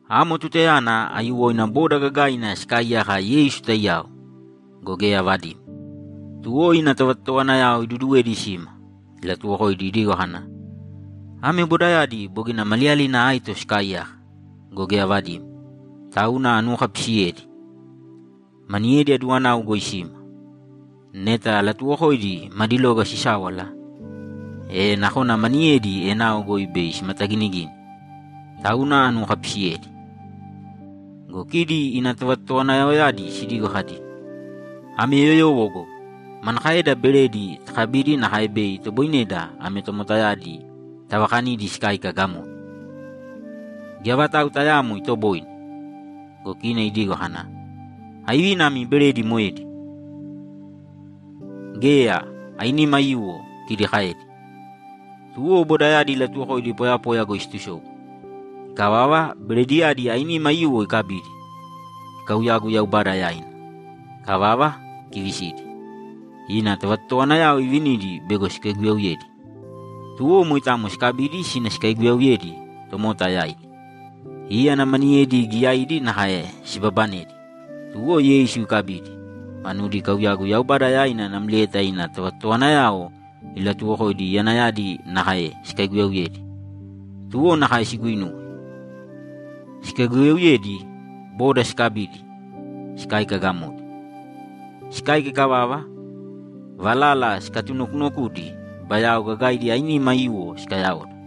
Amo tutayana aiyuwoina boda gagaina sikaaiyaka Yeisu taiyao go, geya avadimo. Tuwo ina tovatotowanayao iduduwedi sima, ilatuwokoidi idigo kana, ‘Ame bodayadi bogina maliyalina aito sikaaiyaka go, geya avadimo, tauna anuwokapisiyedi. Maniyedi aduwanau goi sima. Neta alatuwokoidi madi loga sisáwala, e nakona maniyedi enao goi bei simataginigini. Tauna anuwokapisiyedi.’ Go kidi ina tovatotowanayaoyadi sidigo kadi, ‘Ame yoyowo go! Manakaeda beredi takabidi nakae bei itoboineda ame tomotayadi tavakanidi sikáika gamodi? Geya vatau tayaamo itoboine!’ Go kina idigo kana, ‘Aivina imi beredi moedi?’ ‘Geya, ainima aiyuwo’, kidi kaedi. Tuwo bodayadi ilatuwokoidi poyapoya goi situsobu. Ikavava, berediyadi ainima aiyuwo ikabidi, ikauyagu Yaubada yaina. Ikavava, ikivisidi, ina tovatotowanayao ivinidi bego sikaiguyauyedi. Tuwo moitamo sikabidi sina sikaiguyauyedi tomota yaidi. Íyana maniyedi giyaidi nakae sibabanedi, tuwo Yeisu ikabidi, manudi ikauyagu Yaubada yaina namlieta ina tovatotowanayao ilatuwokoidi iyanayadi nakae sikaiguyauyedi. Tuwo nakae siguinuwe. Sikaiguyauyedi, boda sikabidi, sikáika gamodi. Sikáika ikavava, valala sikatunokunokudi, bayao gagaidi ainima aiyuwo sikayaoda.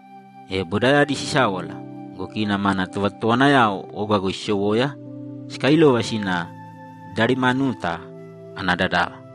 E bodayadi sisáwala go, kina mana tovatotowanayao oga sisowoya, sikailova sina Dalimanuta ana dadava.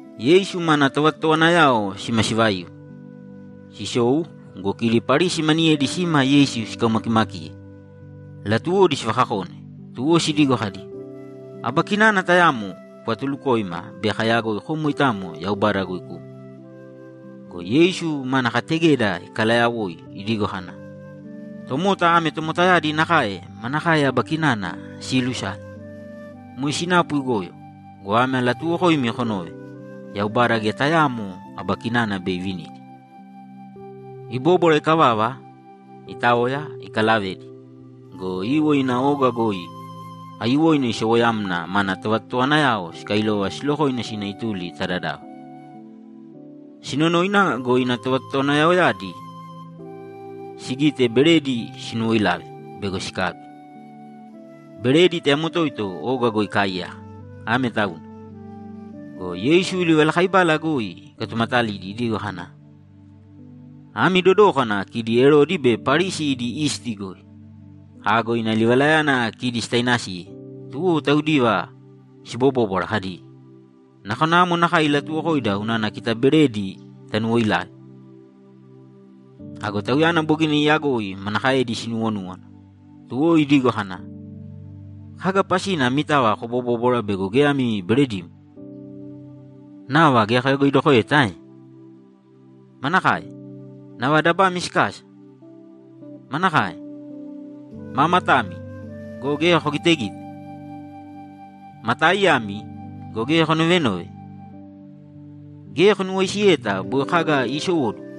Yeisu mana tovatotowanayao sima sivaiu, sisou go, kidi Parisi maniyedi sima Yeisu sikaumakimakiye; latuwodi sivakakone, tuwo sidigo kadi, ‘Aba kinana tayamo kuvatulukōima bei kayagoi kom moitamo Yaubada goi kuma.’ Go Yeisu mana kategeda ikalayawoi idigo kana, ‘Tomota ame tomotayadi nakae manakae aba kinana siilusale? Moe sinapu igoyo go, ame alatuuwokoimi konōve: Yaubada geya tayaamo aba kinana bei ivinidi!’ Ibóbwara ikavava, itaoya, ikalavedi go, iiwo ina oga goi aiyuwoina isowoyamna mana tovatotowanayao sikailova silokoina sina ituli ta dadava. Sinonoina go, ina tovatotowanayaoyadi sigite beredi sinuwoilave bego sikabi. Beredi tayamo toito oga goi ikaaiyaka, ame tauna. Go Yeisu livalakaibala goi ikatumatalidi idigo kana, ‘Ami dodōkana kidi Erodi be Parisi idi isti goi.’ Ago ina livalayana kidi sitainasiye, tuwo taudiva sibobóbwara kadi, ‘Nakona amo nakae ilatuwokoida unana kita beredi tanuwoilave.’ Ago Tauyana bogina iyagoi manakaedi sinuwonúwana, tuwo idigo kana, ‘Kaga pasina amitava kobobóbwara bego geya ami beredimo? Nava geya koyagoidokoeta ae? Manakae? Nava dabami sikasa? Manakae? Maa matami go, geya kogitegite? Ma taaiyami go, geya konovenove? Geya konuwaisiyeta boi kaga iisowóduwo?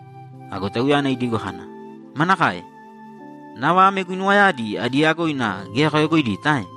Ago Tauyana idigo kana, ‘Manakae? Nava ame guinuwayadi adi yagoina geya koyagoidita ae?’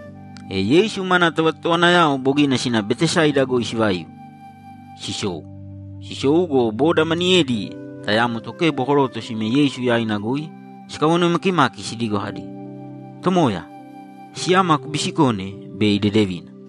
E Yeisu mana tovatotowanayao bogina sina Betesaida goi sivaiu, sisou. Sisou go, boda maniyedi tayamo tokebo koroto sime Yeisu yaina goi sikawanoi makimaki sidigo kadi, ‘Tomoya, siyama kubisikōne bei idedevina.’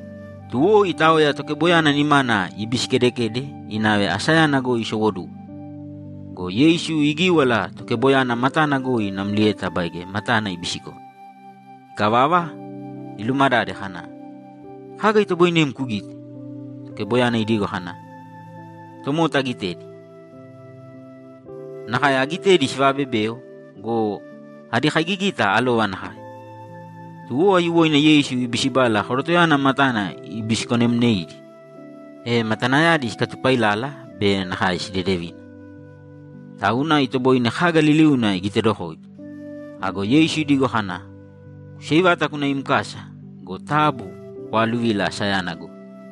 Tuwo itaoya tokeboyana nimana ibisikedekede inave asayana goi sisowóduwo go, Yeisu igíwala tokeboyana matana goi namlieta baige matana ibisikone. Ikavava, ilumadade kana, ‘Kaga itoboinem kugite?’ Tokeboyana idigo kana, ‘Tomota agitedi. Nakae agitedi sivaabebeo go, adi kaigigita alova nakae.’ Tuwo aiyuwoina Yeisu ibisibala korotoyana matana ibisikonemneidi, e matanayadi sikatupailala be nakae sidedevina, tauna itoboine kaga liliuna igitedokoidi. Ago Yeisu idigo kana, ‘Kuseivāta kūna im kasa go, taabu kwaaluvīla asayana goi.’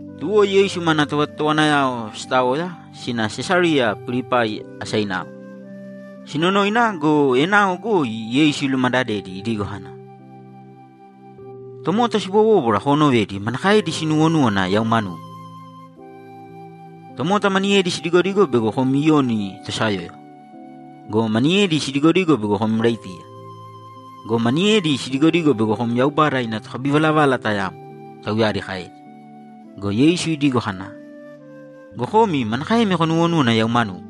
Tuwo Yeisu mana tovatotowanayao sitaoya sina Sesariya Pilipai asainao. Sinonoina go, enao goi Yeisu ilumadadedi idigo kana, ‘Tomota sibobóbwara koonovedi manakaedi sinuuwonúwana yau manugu?’ ‘Tomota maniyedi sidigodigo bego kom Iyoni tosayóyova. Go maniyedi sidigodigo bego kom Iraitiya. Go maniyedi sidigodigo bego kom Yaubada ina tokabivalavala tayamo’, tauyadi kaedi. Go Yeisu idigo kana, ‘Go komi manakaemi konuwonúwana yau manugu?’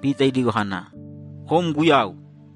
Pita idigo kana, ‘Kom Guyau!’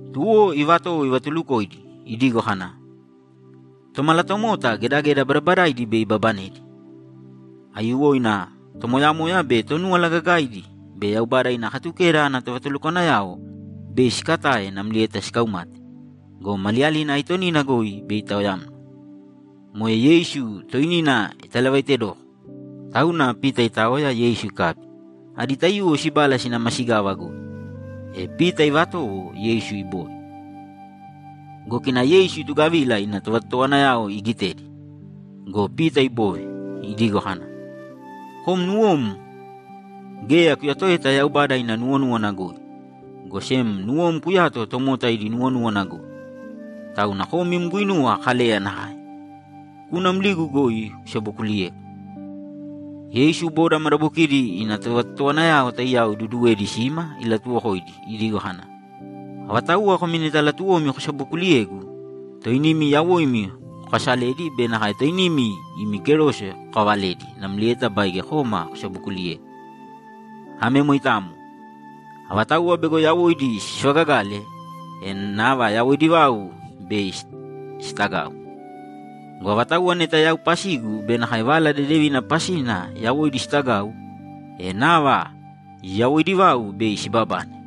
Tuwo ivatowo ivatulukoidi idigo kana, ‘Tomalatomota gedageda badabadaidi bei ibabanedi. Aiyuwoina tomoyamoya be Tonúwala Gagaidi be Yaubada ina Katukeda ana tovatulukwanayao bei sikatae namlieta sikaumate go, maliyalina aitonina goi bei itaoyamna.’ Moe Yeisu toinina italavaitedoko, tauna Pita itaoya Yeisu ikabi, adi taiyuwo sibala sina masigava goi, e Pita ivatowo Yeisu ibove. Go kina Yeisu itugavila ina tovatotowanayao igitedi go, Pita ibove, idigo kana, ‘Kom nuwom geya kuyatoeta Yaubada ina nuwonúwana goi, go sem nuwom kuyato tomota idi nuwonúwana goi. Tauna kom im guinuwa Kaleya nakae. Kūna mligu goi kusabokuliyēgu!’ Yeisu boda madabokidi ina tovatotowanayao taiyao iduduwedi sima ilatuwokoidi idigo kana, ‘Avatauwa komi neta latuwomi kosabokuuliyegu, toinimi yawoimi kokaasalēdi be nakae toinimi imi kerose kokaavalēdi namlieta baige kōma kosabokuuliyēgu. Ame moitamo. Avatauwa bego yawoidi sivagagale, e nava yawoidi vau bei sitagau. Go avatauwa neta yau pasigu be nakae Vala Dedevina pasina yawoidi sitagau, e nava yawoidi vau bei sibabane.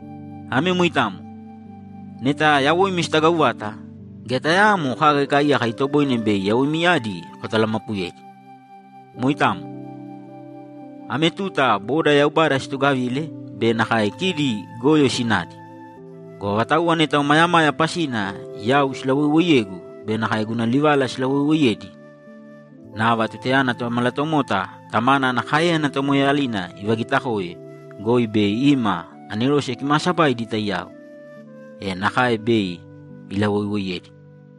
Ame moitamo. Neta yawoimi sitagau vata, geya tayaamo kaga ikaaiyaka itoboine bei yawoimiyadi kotalamapuyedi. Moitamo. Ame tuta boda Yaubada situgavile be nakae kidi goyo sinadi go, avatauwa neta omayamaya pasina yau silawoiwoiyegu be nakae guna livala silawoiwoiyedi, nava tutayana Tomalatomota Tamana ana káeyana tomoeeyalina ivagiitakoe goi bei ima anerose kimaasabaidi taiyao, e nakae bei ilawoiwoiyedi.’